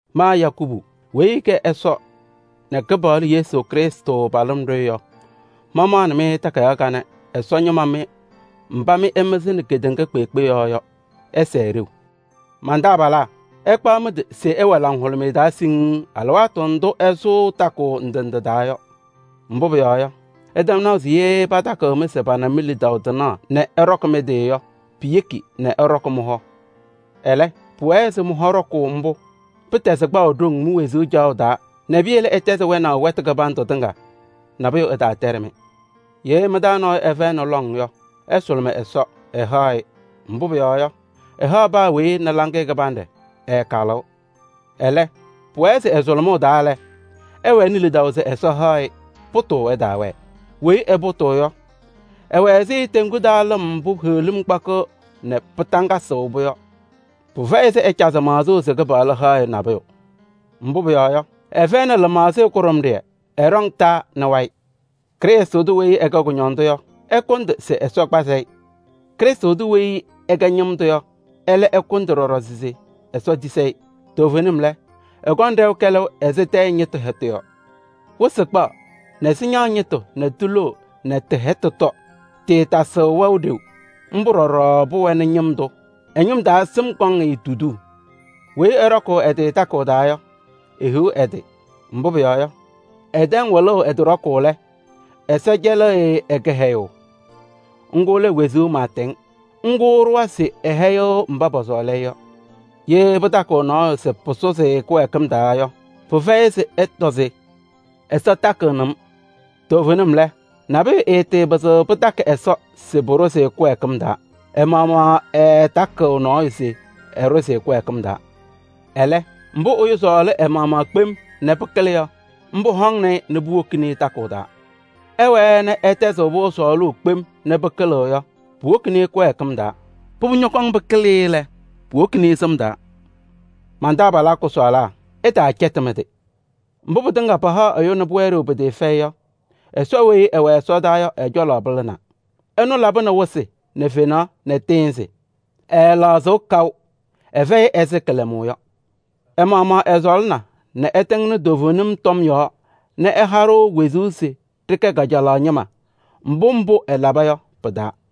Ma Yakubu weyi ɛkɛ Ɛsɔ nɛ Kɩpaɣlʋ Yesu Krɩstʋ pa-tʋmlaɖʋ yɔ, mamaɣnɩ takayaɣ kanɛ Ɛsɔ ñɩma mbá mɩ ɩmɩzɩnɩ kedeŋa kpeekpe yɔɔ yɔ. Ɩsɛɛ ɖeu! Man-taabalaa! Ɩkpaɣ mɩ-tɩ se ɩwɛ laŋhʋlʋmɩyɛ taa siŋŋ alɩwaatʋ ndʋ́ ɩsʋʋ takʋʋ ndɩ ndɩ taa yɔ. Mbʋ́ pʋyɔɔ yɔ, ɩtɛm naʋ se yee pɩtakɩɣ-mɩ se pana mi-lidaʋ tɩnaɣ nɛ ɩɖɔkɩ mɩ-tɩ yɔ, piyeki nɛ ɩɖɔkɩ mɩ-hɔ. Ɛlɛ́, pʋwɛɛ se mɩ-hɔ ɖɔkʋʋ ḿbʋ́, pɩtɛzɩ kpaʋ ɖoŋ mi-wezuu caɣʋ taa nɛ piyele ɩtɛzɩ wɛnaʋ wɛtʋ kɩbandʋ tɩŋa, nabʋyʋ ɛtaatɛɖɩ-mɩ. Yee mɩ-taa nɔɔyʋ ɛfɛyɩnɩ lɔŋ yɔ, ɛsʋlʋmɩ Ɛsɔ, ɛhaɣ-ɩ. Mbʋ́ pʋyɔɔ yɔ, ɛhaɣ paa weyi nɛ laŋɩyɛ kɩbanɖɛ, ɛɛkalɩɣ. Ɛlɛ́, pʋwɛɛ se ɛ-sʋlʋmʋʋ taa lɛ, ɛwɛnɩ lidaʋ se Ɛsɔ haɣ-ɩ, pʋtʋʋ ɛtaawɛɛ. Weyi ɛpʋtʋʋ yɔ, ɛwɛ ɛzɩ teŋgu taa lɩm mbʋ́ heɣlim kpakɩɣ nɛ pɩtaŋgatɩɣ-pʋ yɔ. Pɩfɛyɩ se ɛcazɩ maɣzʋʋ se Kɩpaɣlʋ haɣ-ɩ nabʋyʋ. Mbʋ́ pʋyɔɔ yɔ, ɛfɛyɩnɩ lɩmaɣzɩyɛ kʋɖʋmɖɩyɛ, ɛɖɔŋ taa nɛ wayɩ. Krɩstʋ tʋ weyi ɛkɛ kʋñɔndʋ yɔ, ɛkʋndɩ se Ɛsɔ kpazɩ-ɩ. Krɩstʋ tʋ weyi ɛkɛ ñɩm tʋ yɔ, ɛ́lɛ́ ɛkʋndɩ ɖɔɖɔ se Ɛsɔ tisi-i. Toovenim lɛ, ɛkɔŋ ɖɛʋ kɛlɛʋ ɛzɩ tɛyɛ ñɩtʋ hɛtʋ yɔ. Wɩsɩ kpaɣ nɛ sɩñaɣ ñɩtʋ nɛ tiloo nɛ tɩ-hɛtʋ tɔ, tɩɩtasɩɣ wɛʋ ɖeu. Ḿbʋ́ ɖɔɖɔ pʋwɛnɩ ñɩm tʋ. Ɛ-ñɩm taa sɩm kɔŋ-ɩ tuduu. Weyi ɛɖɔkʋʋ ɛ-tɩ takʋʋ taa yɔ, ehiɣ ɛ-tɩ! Mbʋ́ pʋyɔɔ yɔ, ɛtɛŋ wɩlʋʋ ɛ-tɩ ɖɔkʋʋ lɛ, Ɛsɔ cɛlɩ-ɩ ɛ-kɩhɛyʋʋ: ŋ́gʋ́ lɛ wezuu maatɛŋ. Ŋ́gʋ́ ɛɖʋwa se ɛhɛyɩɣ mbá pɔsɔɔlɩ-ɩ yɔ. Yee pɩtakɩɣ nɔɔyʋ se pʋsʋzɩ-ɩ kɩwɛɛkɩm taa yɔ, pɩfɛyɩ se ɛtɔ se: “Ɛsɔ takɩɣnɩ-m.” Toovenim lɛ, nabʋyʋ ɛɛtɩɩpɩzɩɣ pɩtakɩ Ɛsɔ se pʋɖʋzɩ-ɩ kɩwɛɛkɩm taa, ɛ-maɣmaɣ ɛɛtakɩɣ nɔɔyʋ se ɛɖʋzɩ-ɩ kɩwɛɛkɩm taa. Ɛlɛ́, mbʋ́ ɛyʋ sɔɔlɩ ɛ-maɣmaɣ kpem nɛ pɩkɩlɩ yɔ, ḿbʋ́ hɔŋnɩ-ɩ nɛ puwokini-i takʋʋ taa. Ɛwɛɛ nɛ ɛtɛzɩɣ-pʋ sɔɔlʋʋ kpem nɛ pɩkɩlɩɣ yɔ, puwokini-i kɩwɛɛkɩm taa. Pʋbʋ ñɔkɔŋ pɩkɩlɩ-ɩ lɛ, puwoni-i sɩm taa. Man-taabalaa kʋsɔɔlaa! Ɩtaacɛtɩ mɩ-tɩ. Mbʋ́ pɩtɩŋa pahaɣ ɛyʋ nɛ pʋwɛ ɖeu pɩtɩɩfɛyɩ yɔ, Ɛsɔ weyi ɛwɛ ɛsɔdaa yɔ ɛ-cɔlɔ pɩlɩnaa. Ɛnʋ labɩnɩ wɩsɩ nɛ fenaɣ nɛ tɩɩnzɩ. Ɛɛlɛɣzɩɣ kaʋ: ɛfɛyɩ ɛzɩ kɩlɛmʋʋ yɔ. Ɛ-maɣmaɣ ɛsɔɔlɩna nɛ ɛtɩŋnɩ toovenim tɔm yɔɔ nɛ ɛha-ɖʋ wezuu se ɖɩkɛ kajalaɣ ñɩma, mbʋ́ mbʋ́ ɛlaba yɔ pɩ-taa.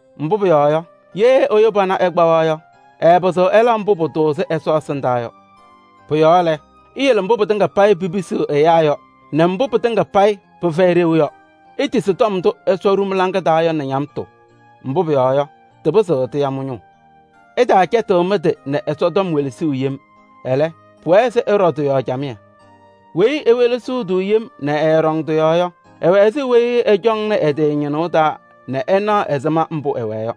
Mbʋ́ pʋyɔɔ yɔ, yee ɛyʋ pana ɛkpawa yɔ, ɛɛpɩzɩɣ ɛla mbʋ́ pʋtʋʋzɩ Ɛsɔ ɛsɩndaa yɔ. Pʋ-yɔɔ lɛ, iyele mbʋ́ pɩtɩŋa payɩ pipisiɣ ɛyáa yɔ nɛ mbʋ́ pɩtɩŋa payɩ pɩfɛyɩ ɖeu yɔ. Itisi tɔm ndʋ́ Ɛsɔ ɖu mɩ-laŋa taa yɔ nɛ ñamtʋ, mbʋ́ pʋyɔɔ yɔ, tɩpɩzɩɣ tɩya mɩ-ñʋʋ. Ɩtaacɛtɩɣ mɩ-tɩ nɛ Ɛsɔtɔm welesuu yem. Ɛlɛ́, pʋwɛɛ se ɩɖɔ tɩ-yɔɔ camɩyɛ. Weyi ewelesiɣ-tʋ yem nɛ ɛɛɖɔŋ tɩ-yɔɔ yɔ, ɛwɛ ɛzɩ weyi ɛcɔŋnɩ ɛ-tɩ ñɩnʋʋ taa nɛ ɛnaɣ ɛzɩma mbʋ́ ɛwɛɛ yɔ.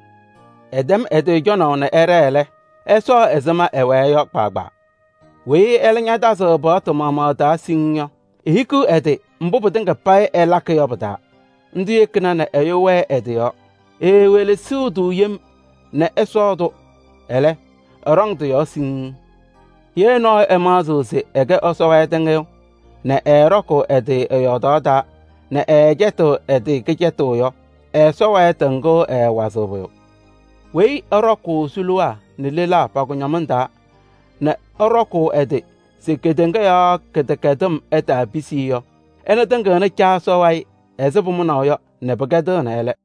Ɛtɛm ɛ-tɩ cɔnaʋ nɛ ɛɖɛɛ lɛ, ɛsɔɔ ɛzɩma ɛwɛɛ yɔ kpaagbaa. Weyi ɛ́lɛ́ ñatazɩɣ paɣtʋ maɣmaɣ taa siŋŋ yɔ, ehikiɣ ɛ-tɩ mbʋ́ pɩtɩŋa payɩ ɛlakɩ yɔ pɩ-taa. Ńdʋ́ yekina nɛ ɛyʋ wɛɛ ɛ-tɩ yɔɔ. Eewelesiɣ-tʋ yem nɛ ɛsɔɔ-tʋ, ɛlɛ́, ɛɖɔŋ tɩ-yɔɔ siŋŋ. Yee nɔɔyʋ ɛmaɣzɩɣ se ɛkɛ Ɛsɔ wayɩ tɩŋɩyʋ nɛ ɛɛɖɔkʋʋ ɛ-tɩ ɛ-yɔɔdaɣ taa nɛ ɛcɛtɩɣ ɛ-tɩ kɩcɛtʋ yɔ, ɛ-Ɛsɔ wayɩ tɩŋʋʋ ɛɛwazɩɣ pʋyʋ. Weyi ɛɖɔkʋʋ suluwaa nɛ lelaa pa-kʋñɔmɩŋ taa nɛ ɛɖɔkʋʋ ɛ-tɩ se kedeŋa yɔɔ kɩdɛkɛdɩm ɛtaapisi-i yɔ, ɛnʋ tɩŋɩɣnɩ Caa Ɛsɔ wayɩ ɛzɩ pʋmʋnaʋ yɔ nɛ pɩkɛdɩɣnɩ ɛ́lɛ́.